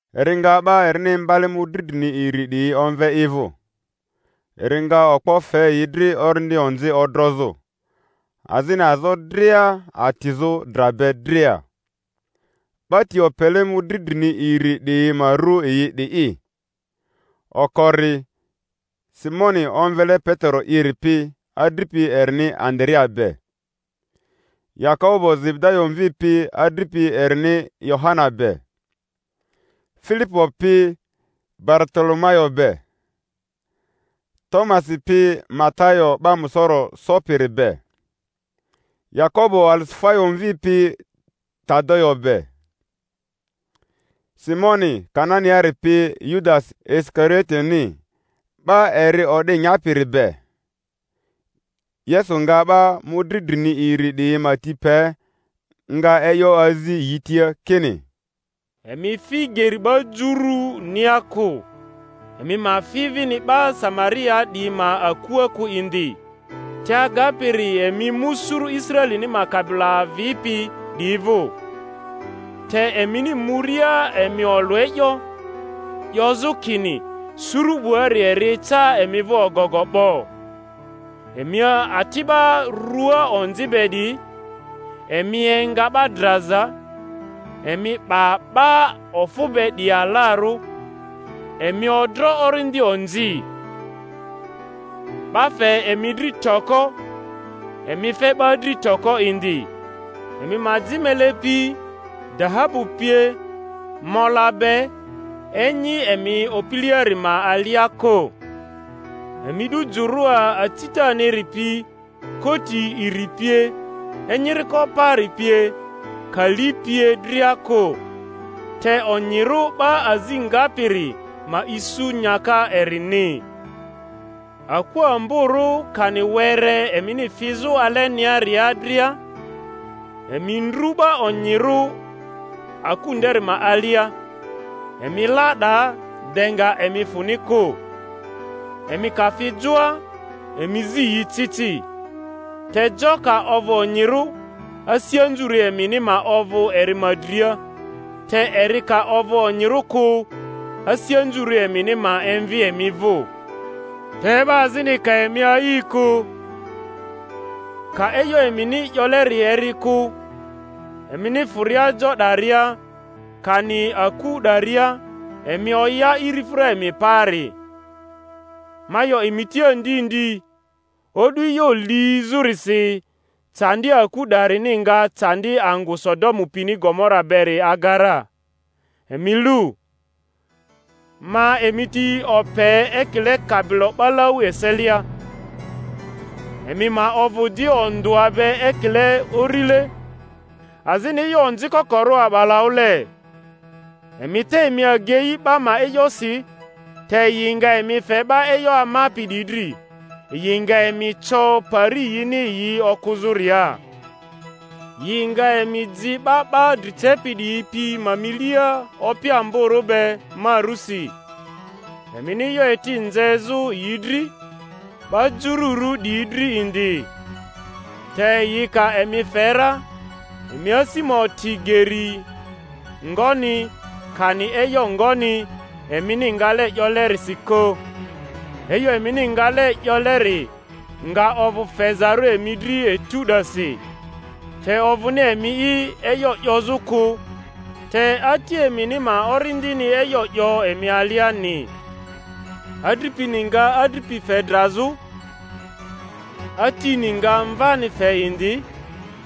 Eri nga 'ba erini imbale mᴜdri drini iri 'diyi omve i vᴜ, eri nga okpo fe yi dri orindi onzi odrozᴜ, azini azo dria atizᴜ dra be dria. 'Ba ti opele mᴜdri drini iri 'diyi ma ru yi 'di'i: okori Simoni omvele Petero'iri pi adripi erini Andarea be; Yakobo Zebedayo mvi pi adripi erini Yohana be; Filipo pi Baritolomayo be; Tomasi pi Matayo 'ba musoro sopiri be; Yakobo Alifayo mvi pi Tadayo be; Simoni Kananiari pi Yudasi Isikarioteni, 'ba eri o'di nyapiri be. Yesu nga 'ba mᴜdri drini iri 'diyi ma ti pe, nga e'yo azi yi tia kini, Emi fi geri 'ba jurunia kᴜ, emi ma fi vini 'ba Samariaa 'diyi ma akua kᴜ indi, te agapiri emi mu suru Israelini ma kabilo avipi 'diyi vᴜ. Te emini muria emi olᴜ e'yo, 'yozᴜ kini, Suru 'buari eri eca emi vᴜ ogogo 'bo. Emi ati 'ba rᴜa onzi be 'diyi, emi enga 'ba draza, emi 'ba 'ba ofᴜ be 'diyi alarᴜ, emi odro orindi onzi. 'Ba fe emi dri toko, emi fe 'ba dri toko indi. Emi ma ji mele pi, dahabu pie, mola be enyi emi opileari ma alia kᴜ; emi 'du jᴜrᴜa acitaniri pi, koti iri pie, enyiriko paari pie, kali pie dria kᴜ; te onyirᴜ 'ba azi ngapiri ma isu nyaka erini. Aku amborᴜ kani were emini fizᴜ aleniaria dria, emi ndru 'ba onyirᴜ aku nderi ma alia, emi la 'daa de nga emi fᴜni kᴜ. Emi ka fi joa, emi zi yi ci ci. Te jo ka ovᴜ onyirᴜ, asi anzurᴜ emini ma ovᴜ eri ma dria; te eri ka ovᴜ onyirᴜ kᴜ, asi anzurᴜ emini ma emvi emi vᴜ. Te 'ba azini ka emi a'i kᴜ, ka e'yo emini 'yoleri eri kᴜ, emini fᴜria jo 'daria, kani aku 'daria, emi oya irifᴜra emi paari. Ma 'yo emi tia ndi ndi, o'du e'yo lizᴜrisi candi aku 'darini nga candi angᴜ Sodomu pini Gomora beri aga ra. Emi lu, ma emi ti ope ekile kabilo 'balau eselia; emi ma ovᴜ di ondᴜa be ekile urile, azini e'yo onzi kokorᴜ a'balaᴜle. Emi te emi agei 'ba ma e'yosi; te yi nga emi fe 'ba e'yo amapi 'diyi dri, yi nga emi co pari yini yi okᴜzᴜria, yi nga emi ji 'ba 'ba dri cepi 'diyi pi ma milia opi amborᴜ be ma rusi, emini e'yo eti nzezᴜ yi dri, 'ba jururᴜ 'diyi dri indi. Te yi ka emi fe ra, emi asi ma oti geri ngoni, kani e'yo ngoni, emini ngale 'yolerisi kᴜ; e'yo emini ngale 'yoleri nga ovᴜ fezarᴜ emi dri etu 'dasi; te ovᴜni emi'i e'yo 'yozᴜ kᴜ, te Ati emini ma Orindini e'yo 'yo emi aliani Adripini nga adripi fe drazᴜ, atini nga mvani fe indi,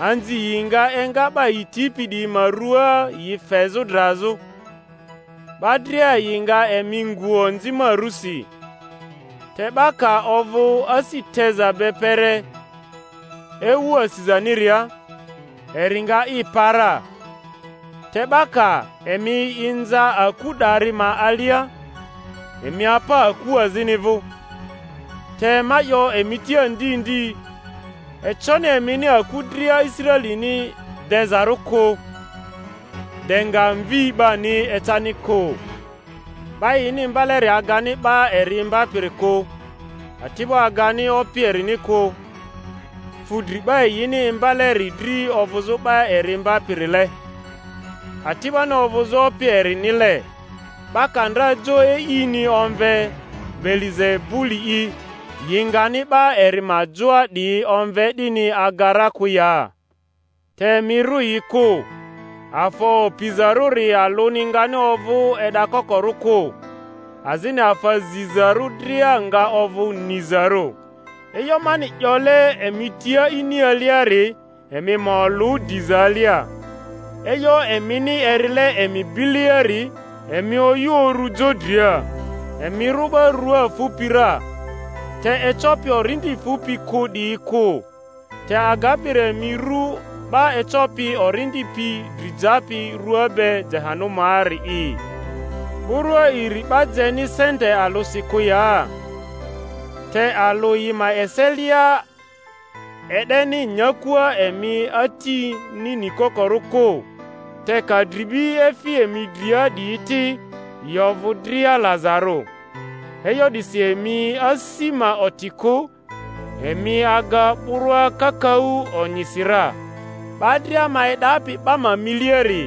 anzi yi nga enga 'ba yi tipi 'diyi ma ruaa yi fezᴜ drazᴜ; 'ba dria yi nga emi ngu onzi ma rusi. Te 'ba ka ovᴜ asi teza be kpere ewu asizaniria, eri nga i pa ra. Te 'ba ka emi inza aku 'dari ma alia, emi apa aku azini vᴜ; te ma 'yo emi tia ndi ndi, econi emini aku dria Israelini dezarᴜ kᴜ, de nga Mvi 'bani ecani kᴜ. 'Ba yini imbaleri agani 'ba eri imbapiri kᴜ, ati'bo agani opi erini kᴜ; fu dri 'ba yini imbaleri dri ovᴜzᴜ 'ba eri imbapirile, ati'boni ovᴜzᴜ opi erinile. 'Ba ka ndra jo e'ini omve Beelizebuli'i, yi ngani 'ba eri ma joa 'diyi omve 'dini aga ra kᴜ ya? Te emi rᴜ yi kᴜ; afa opizarᴜri alᴜni ngani ovᴜ e'dakokorᴜ kᴜ, azini afa zizarᴜ dria nga ovᴜ nizarᴜ. E'yo mani 'yole emi tia ini aliari, emi ma olᴜ diza alia; e'yo emini erile emi bileari, emi oyᴜ urᴜ jo dria. Emi rᴜ 'ba rua fupi ra, te ecopi orindi fupi kᴜ 'diyi kᴜ; te agapiri emi rᴜ 'ba ecopi orindi pi dri japi rua be Jehanumaari'i. Burᴜa iri 'ba jeni sente alᴜsi kᴜ ya? Te alᴜ yi ma eselia e'deni nyakua emi atini nikokorᴜ kᴜ. Te ka dribi efi emi dria 'diyi ti, yi ovᴜ dria lazarᴜ. E'yo 'disi emi asi ma oti kᴜ; emi aga burᴜa kakaᴜ onyisi ra. 'Ba dria ma e'dapi 'ba ma miliari,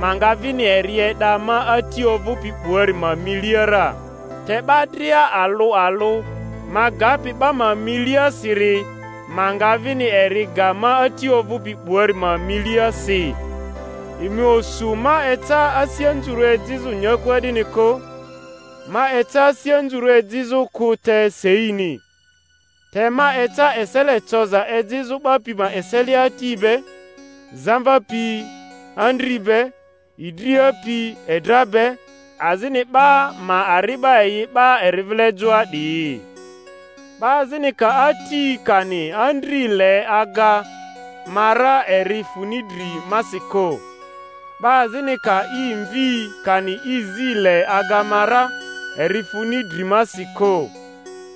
ma nga vini eri e'da ma Ati ovᴜpi 'buari ma milia ra; te 'ba dria alᴜ alᴜ ma gapi 'ba ma milia siri, ma nga vini eri ga ma Ati ovᴜpi 'buari ma milia si. Emi osu ma eca asi anzurᴜ ejizᴜ nyakua 'dini kᴜ; ma eca asi anzurᴜ ejizᴜ kᴜ, te seini. Te ma eca esele coza ejizᴜ 'ba pi ma eselea ati be, zamva pi andri be, idria pi edra be; azini 'ba ma ari'ba yi 'ba eri vile joa 'diyi. 'Ba azini ka ati kani andri le aga ma ra, eri funi dri masi kᴜ; 'ba azini ka i mvi kani i zi le aga ma ra, eri funi dri masi kᴜ;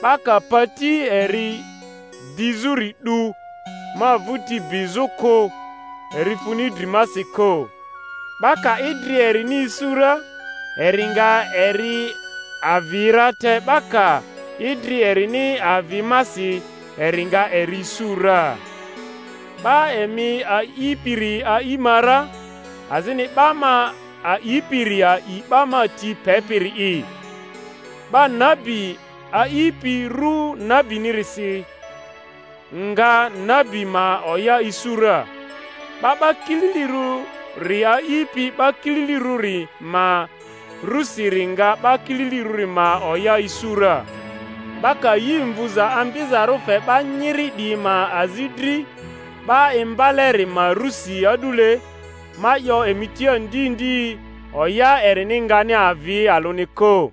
'ba ka pati eri dizᴜri 'du ma vᴜti bizᴜ kᴜ, eri funi dri masi kᴜ. 'Ba ka idri erini isu ra, eri nga eri avi ra; te 'ba ka idri erini avi masi, eri nga eri isu ra. 'Ba emi a'ipiri a'i ma ra, azini 'ba ma a'ipiri a'i 'ba ma ti pepiri'i. 'Ba nabi a'ipi ru nabinisiri nga nabi ma oya isu ra, 'ba 'ba kililirᴜri a'ipi 'ba kililirᴜri ma rusiri nga 'ba kililirᴜri ma oya isu ra. 'Ba ka yi mvuza ambizarᴜ fe 'ba nyiri 'diyi ma azi dri 'ba imbaleri ma rusi a'dule, ma 'yo emi tia ndi ndi, oya erini ngani avi alᴜni kᴜ.